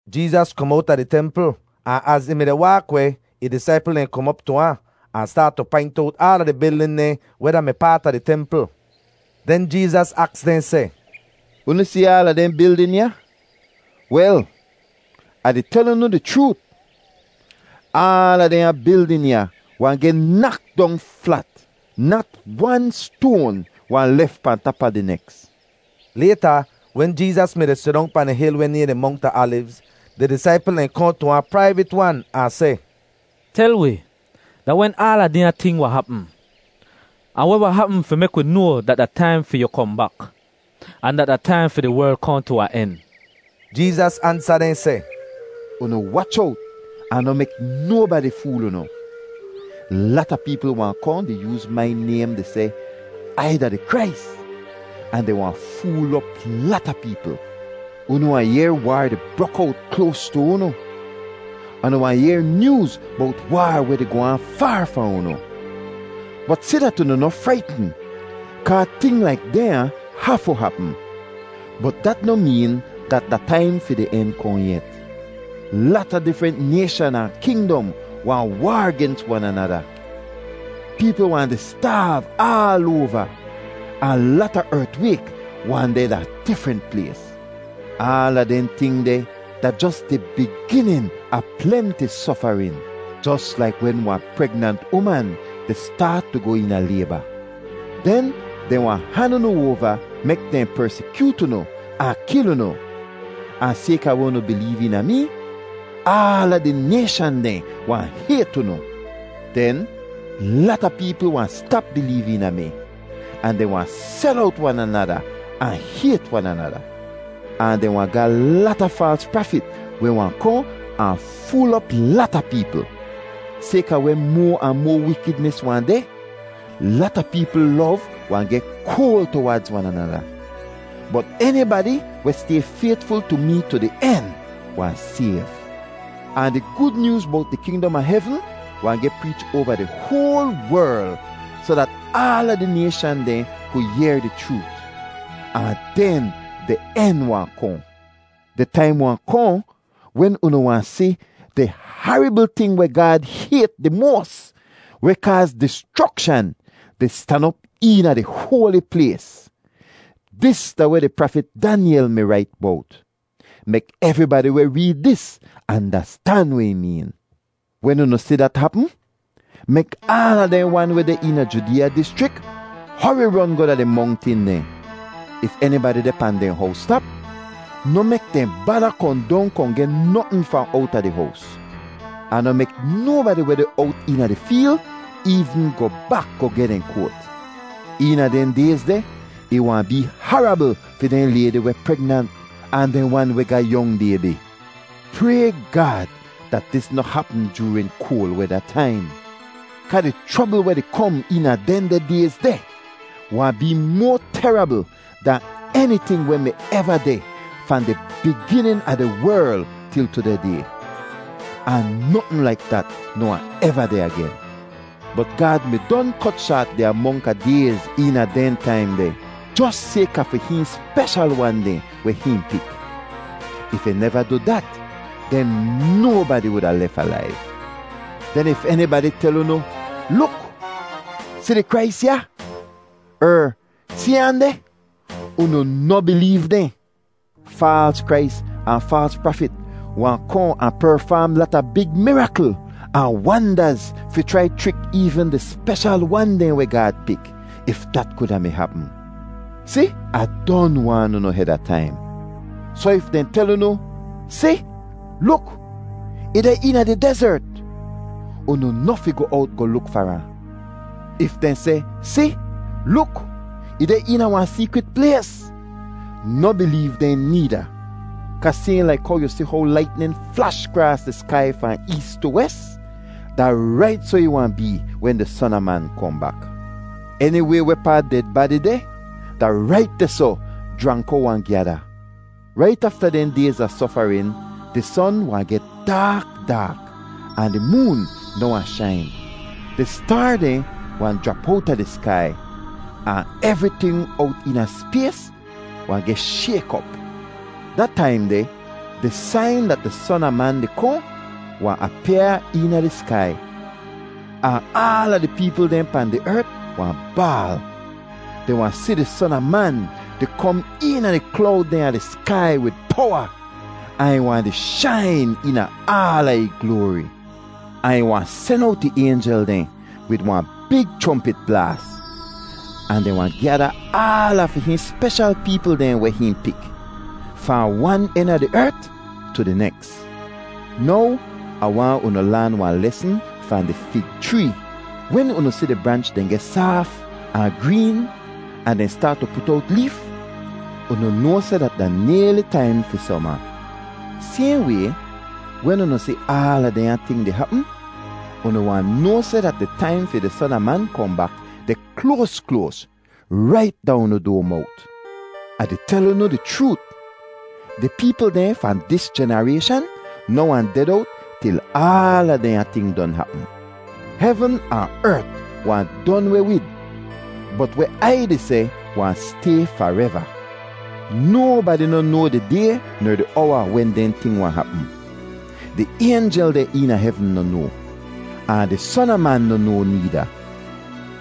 Jeezas kom owta di templ ahn az ih mi-di waak weh, ih disaipl dehn kom op tu ahn, ahn staat tu paint owt aala di bildin dehn weh da-mi paat a di templ. Den Jeezas aks dehn seh, “Unu si aala dehn bildin ya? Wel, Ah di tel unu di chroot, aala dehnya bildin ya wahn geh nak dong flat; nat wan stoan wahn lef pahn tap a di neks.” Layta, wen Jeezas mi-di sidong pahn di hil weh nayhn di Mongt a Alivz, di disaipl dehn kohn tu ahn praivit-wan ahn seh, “Tel wi, da wen aala dehnya ting wahn hapm? Ahn weh wahn hapm fi mek wi noa dat da taim fi yu kohn bak, ahn dat da taim fi di werl kohn tu wahn en?” Jeezas ansa dehn seh, “Unu wach owt ahn noh mek nobadi fool unu. Lata peepl wahn kohn di yooz mai naym di seh, ‘Ai da di Krais,’ ahn dehn wahn fool op lata peepl. Unu wahn yehr waar di brok owt kloas tu unu, ahn unu wahn yehr nyooz bowt waar weh di goh aan faar fahn unu. Bot si dat unu noh fraitn kaa ting laik dehnya hafu hapm, bot dat noh meen dat da taim fi di en kohn yet. Lata difrent nayshan ahn kingdom wahn waar gens wan anada. Peepl wahn di staav aal oava ahn lata ertwayk wahn deh da difrent plays. Aala dehn ting deh da jos di biginin a plenti sofarin, jos laik wen wahn pregnant uman di staat tu goh eena layba. Den dehn wahn han unu oava mek dehn persikyoot unu ahn kil unu, ahn sayka weh unu bileev eena mee, aala di nayshan dehn wahn hayt unu. Den lata peepl wahn stap bileev eena mi, ahn dehn wahn sel owt wan anada ahn hayt wan anada. Ahn dehn wahn ga lata faals prafit weh wahn kohn ahn fool op lata peepl. Sayka weh moa ahn moa wikidnis wahn deh, lata peepl lov wahn geh koal tuwaadz wan anada. Bot enibadi weh stay faytful tu mee tu di en wahn sayv. Ahn di Gud Nyooz bowt di kingdom a hevn wahn geh preech oava di hoal werl soh dat aala di nayshan dehn ku yehr di chroot, ahn den di en wahn kohn. “Di taim wahn kohn wen unu wahn si ‘di harabl ting weh Gaad hayt di moas, weh kaaz dischrokshan,’ di stan op eena di hoali plays. Dis da weh di prafit Danyel mi rait bowt. (Mek evribadi weh reed dis andastan weh ih meen.) Wen unu si dat hapm, mek aala dehn wan weh deh eena Judeeya dischrik hori ron goh da di mongtin dehn. If enibadi deh pahn dehn howstap, noh mek dehn bada kohn dong kohn geh notn fahn owta di hows. Ahn noh mek nobadi weh deh owt eena di feel eevn goh bak goh geh dehn koat. Eena dehn dayz deh ih wahn bee harabl fi dehn laydi weh pregnant ahn dehn wan weh ga yong baybi! Pray Gaad dat dis noh hapm joorin koal weda taim, kaa di chrobl weh di kom eena dehndeh dayz deh wahn bee moa terabl dahn eniting weh mi eva deh fahn di biginin a di werl til tudeh day. Ahn notn laik dat noh wahn eva deh agen. Bot Gaad mi don kot shaat di amonk a dayz eena dehn taim deh, jos sayka fi hihn speshal wan dehn weh hihn pik. If ih neva du dat, den nobadi wuda lef alaiv. “Den if enibadi tel unu, ‘Luk! Si di Krais ya!’ er, ‘Si ahn deh!’ unu noh bileev dehn. Faals Krais ahn faals prafit wahn kohn ahn perfaam lata big mirakl ahn wandaz fi chrai chrik eevn dehn speshal wan dehn weh Gaad pik, if dat kuda mi hapm. Si, Ah don waan unu heda taim. “Soh if dehn tel unu, ‘Si, luk! Ih deh eena di dezert,’ unu noh fi goh owt goh luk far ahn. If dehn seh, ‘Si, luk! Ih deh eena wahn seekrit plays,’ noh bileev dehn needa. Kaa sayhn laik how yu si how laitnin flash kraas di skai fahn ees tu wes, da rait soh ih wahn bee wen di Son a Man kohn bak. Eniway wehpaa ded badi deh, da rait dehsoh jranko wahn gyada. “Rait afta dehn dayz a sofarin ‘di son wahn geh daak daak, ahn di moon noh wahn shain. Di staar dehn wahn jrap owta di skai, ahn evriting owt eena spays wahn geh shayk op.’ “Da taim deh di sain dat di Son a Man di kohn wahn apyaa eena di skai, ahn aala di peepl dehn pahn di ert wahn baal. Dehn wahn si di Son a Man di kom eena di klowd dehn a di skai wid powa, ahn ih wahn di shain eena aala ih gloari. Ahn ih wahn sen owt ih aynjel dehn wid wahn big chrompit blaas, ahn dehn wahn gyada aala fi hihn speshal peepl dehn weh hihn pik, fahn wan en a di ert tu di neks. “Now Ah waahn unu laan wahn lesn fahn di fig chree: wen unu si di branch dehn geh saaf ahn green ahn dehn staat tu put owt leef, unu noa seh dat da nayli taim fi soma. Sayhn way, wen unu si aala dehnya ting di hapm, unu wahn noa seh dat di taim fi di Son a Man kohn bak deh kloas kloas, rait da unu doa mowt! Ah di tel unu di chroot, di peepl dehn fahn dis jenarayshan noh wahn ded owt til aala dehnya ting don hapm. Hevn ahn ert wahn don weh wid, bot weh Ai di seh wahn stay fareva. “Nobadi noh noa di day ner di owa wen dehn ting wahn hapm. Di aynjel dehn eena hevn noh noa, ahn di Son a Man noh noa needa.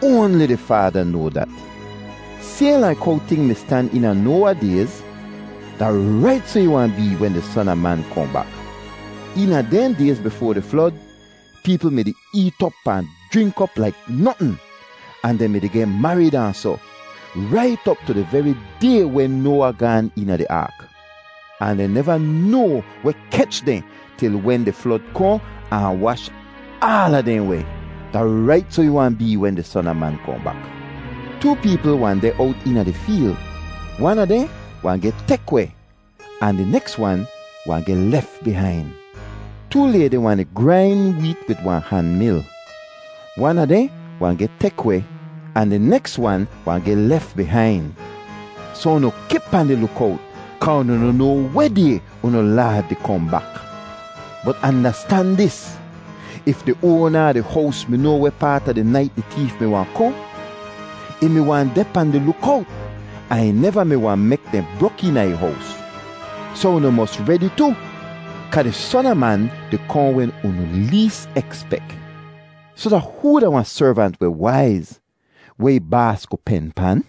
Oanli di Faada noa dat. “Sayhn laik how ting mi stan eena Noawa dayz, da rait soh ih wahn bee wen di Son a Man kohn bak. Eena dehn dayz bifoa di flod, peepl mi-di eet op ahn jrink op laik notn, ahn dehn mi-di geh marid ahn soh, rait op tu di veri day wen Noawa gaan eena di aak; ahn dehn neva noa weh kech dehn til wen di flod kohn ahn wash aala dehn weh. Da rait soh ih wahn bee wen di Son a Man kohn bak. Too peepl wahn deh owt eena di feel; wan a dehn wahn geh tek weh ahn di neks wan wahn geh lef bihain. Too laydi wahn di grain weet wid wahn han mil; wan a dehn wahn geh tek weh ahn di neks wan wahn geh lef bihain. “Soh unu kip pahn di lukowt kaa unu noh noa weh day unu Laad di kohn bak. Bot andastan dis: If di oana a di hows mi noa weh paat a di nait di teef mi wahn kohn, ih mi wahn deh pahn di lukowt ahn ih neva mi wahn mek dehn brok eena ih hows. Soh unu mos redi tu, kaa di Son a Man di kohn wen unu lees ekspek. “Soh da hoo da wahn servant weh waiz, weh ih baas ku pen pan?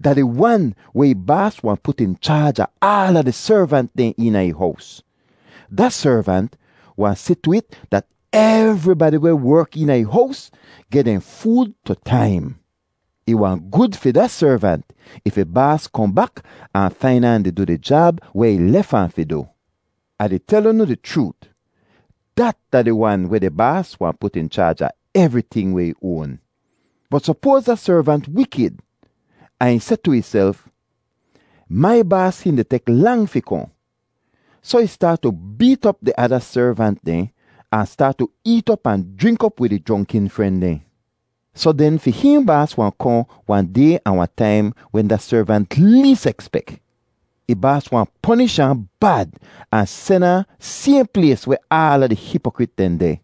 Da di wan weh ih baas wahn put in chaaj a aala di servant dehn eena ih hows; da servant wahn si tu it dat evribadi weh werk eena ih hows geh dehn food tu taim. Ih wahn gud fi da servant if ih baas kohn bak ahn fain ahn di du di jab weh ih lef ahn fi du. Ah di tel unu di chroot, dat da di wan weh di baas wahn put in chaaj a evriting weh ih oan. “Bot sopoaz da servant wikid ahn ih seh tu ihself, ‘Mai baas hihn di tek lang fi kohn.’ Soh ih staat tu beet op di ada servant dehn ahn staat tu eet op ahn jrink op wid ih jronkin fren dehn. Soh den, fi hihn baas wahn kohn wahn day ahn wahn taim wen da servant lees ekspek. Ih baas wahn ponish ahn bad ahn sen ahn sayhn plays weh aala di hipokrit dehn deh.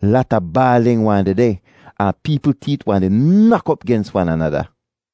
Lata baalin wahn dehdeh ahn peepl teet wahn di nak op gens wan anada.